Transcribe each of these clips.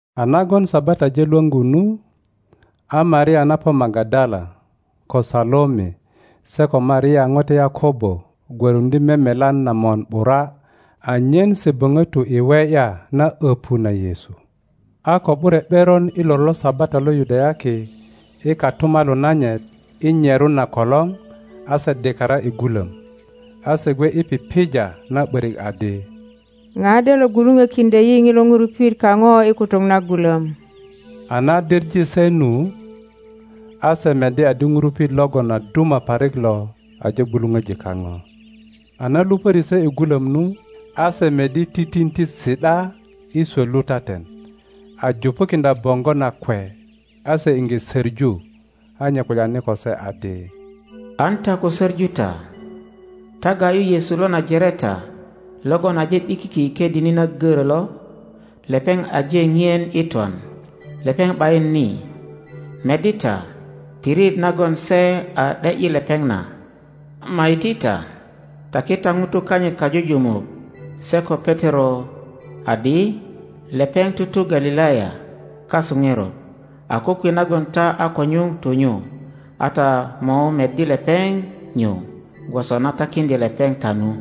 A nagon Sabata aje lwöŋgu nu, a Maria na po Magadala, ko Salome, se ko Maria ŋote Yakobo gwöruŋdye memelan na mon ’bura anyen se boŋo tu i we ’ya na öpu na Yesu. A ko ’bure ’beron i lor lo Sabata lo Yudayaki i kotumalu nanyit i nyerun na kolor, a se dikara i gulom. A se gwe i pipija na ’börik adi, ŋa de lo gwuluŋokiŋdyo yi ŋilo ŋurupit kaŋo i kutuk na gulom? A na diŋe se nu, a se meddi adi ŋurupit logon a duma parik lo aje gwuluŋoji kaŋo. A na lupöri se i gulöm nu, a se meddi titinti si ’da i swot lutaten, a jupukiŋdya boŋgo nakwe; a se iŋge söŋu. A nye kulyani ko se adi, An ta ko söŋu ta; ta ga ’yu Yesu lo Najareta logon aje ’bikiki i ködini na görö lo. Lepeŋ aje ŋien i twan, lepeŋ ’bayin ni. Meddi ta pirit nagon se a ’de ’yi lepeŋ na. Ama iti ta, taki ta ŋutu kanyit kajujumuk se ko Petero adi lepeŋ tutu Galilaya kasu ŋerot; a kokwe nagon ta a ko nyuŋ tu nyu, a ta mo meddi lepeŋ nyu gwoso na takiŋdye lepeŋ ta nu.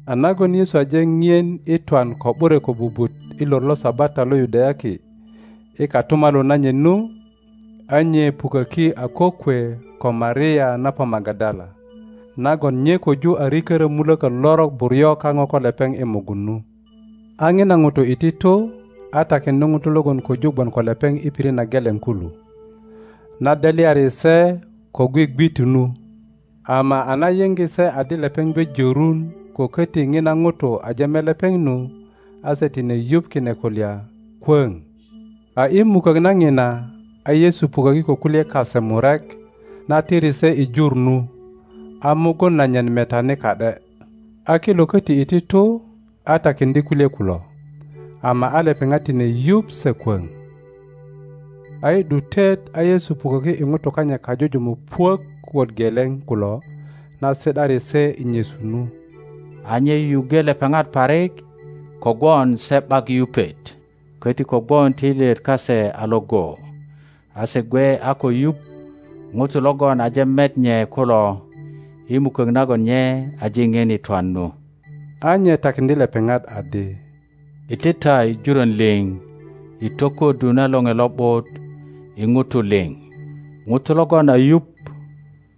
A nagon Yesu aje ŋien i twan ko ’bure kobubut i lor lo Sabata lo Yudayaki i kotumalu nanyit nu, a nye puköki a kokwe ko Maria na po Magadala, nagon nye köju a rikörö mulökö lorok buryo kaŋo ko lepeŋ i mugun nu. A ŋina ŋuto iti tu a takiŋdye ŋutu logon köju gwon ko lepeŋ i pirit na geleŋ kulu, na delyari se ko gwigwitu nu. Ama a na yiŋge se adi lepeŋ gwe jörun ko köti ŋina ŋuto aje met lepeŋ nu, a se tine yuŋ kine kulya kwöŋ. A i mukök na ŋina a Yesu puköki ko kulye kase murek na tiri se i jur nu, a mugun nanyit metani ka ’de. A kilo köti iti tu a takiŋdye kulye kulo, ama a lepeŋat tine yuŋ se kwoŋ. A i ’dutet a Yesu puköki i ŋutu kanyit kajujumuk puök wot geleŋ kulo na si ’dari se i nyesu nu. A nye yuyuŋge lepeŋat parik kogwon se ’bak yupet köti kogwon töilyet kase a iŋgo, a se gwe a ko yuŋ ŋutu logon aje met nye kulo i mukök nagon nye aje ŋien i twan nu. a nye takiŋdye lepeŋat adi, Iti ta i jurön liŋ i tokuöddu na Loŋe Lo ’but i ŋutu liŋ. ŋuto logon a yuŋ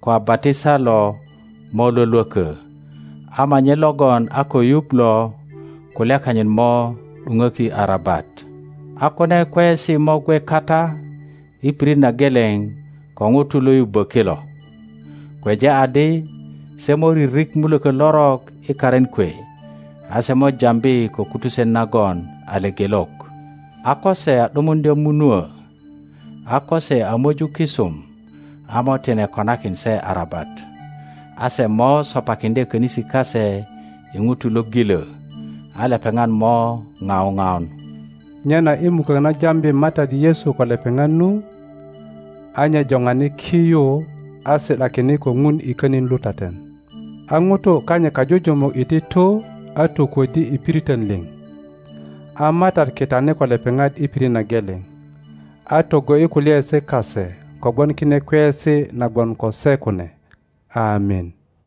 ko a batisa lo mo lwölwökö; ama nye logon a ko yuŋ lo kulya kanyit mo ’duŋöki arabat. a kune kweyesi mo gwe kata i pirit na geleŋ ko ŋutu lo yubbö kilo: kweja adi se mo ririk mulökö lorok i karin kwe; a se mo jambi ko kutusen nagon a lepelok; a ko se a ’dumuŋdya munuö, a ko se a möju kisum a mo tine konakin se arabat; a se mo sopakiŋdye könisi kase i ŋutu lo gilö, a lepeŋat mo ŋau ŋaun. Nyena i mukök na jambi MATAT Yesu ko lepeŋat nu, a nye joŋani ki yu a si ’dakine ko Ŋun i könin lutaten. A ŋutu kanyit kajujumuk iti tu a tokuöddi i piriton liŋ, a MATAT kitani ko lepeŋat i pirit na geleŋ, a togo ’yi kulyaesi kase kogwon kine kweyesi na gwon ko se kune. Amin.]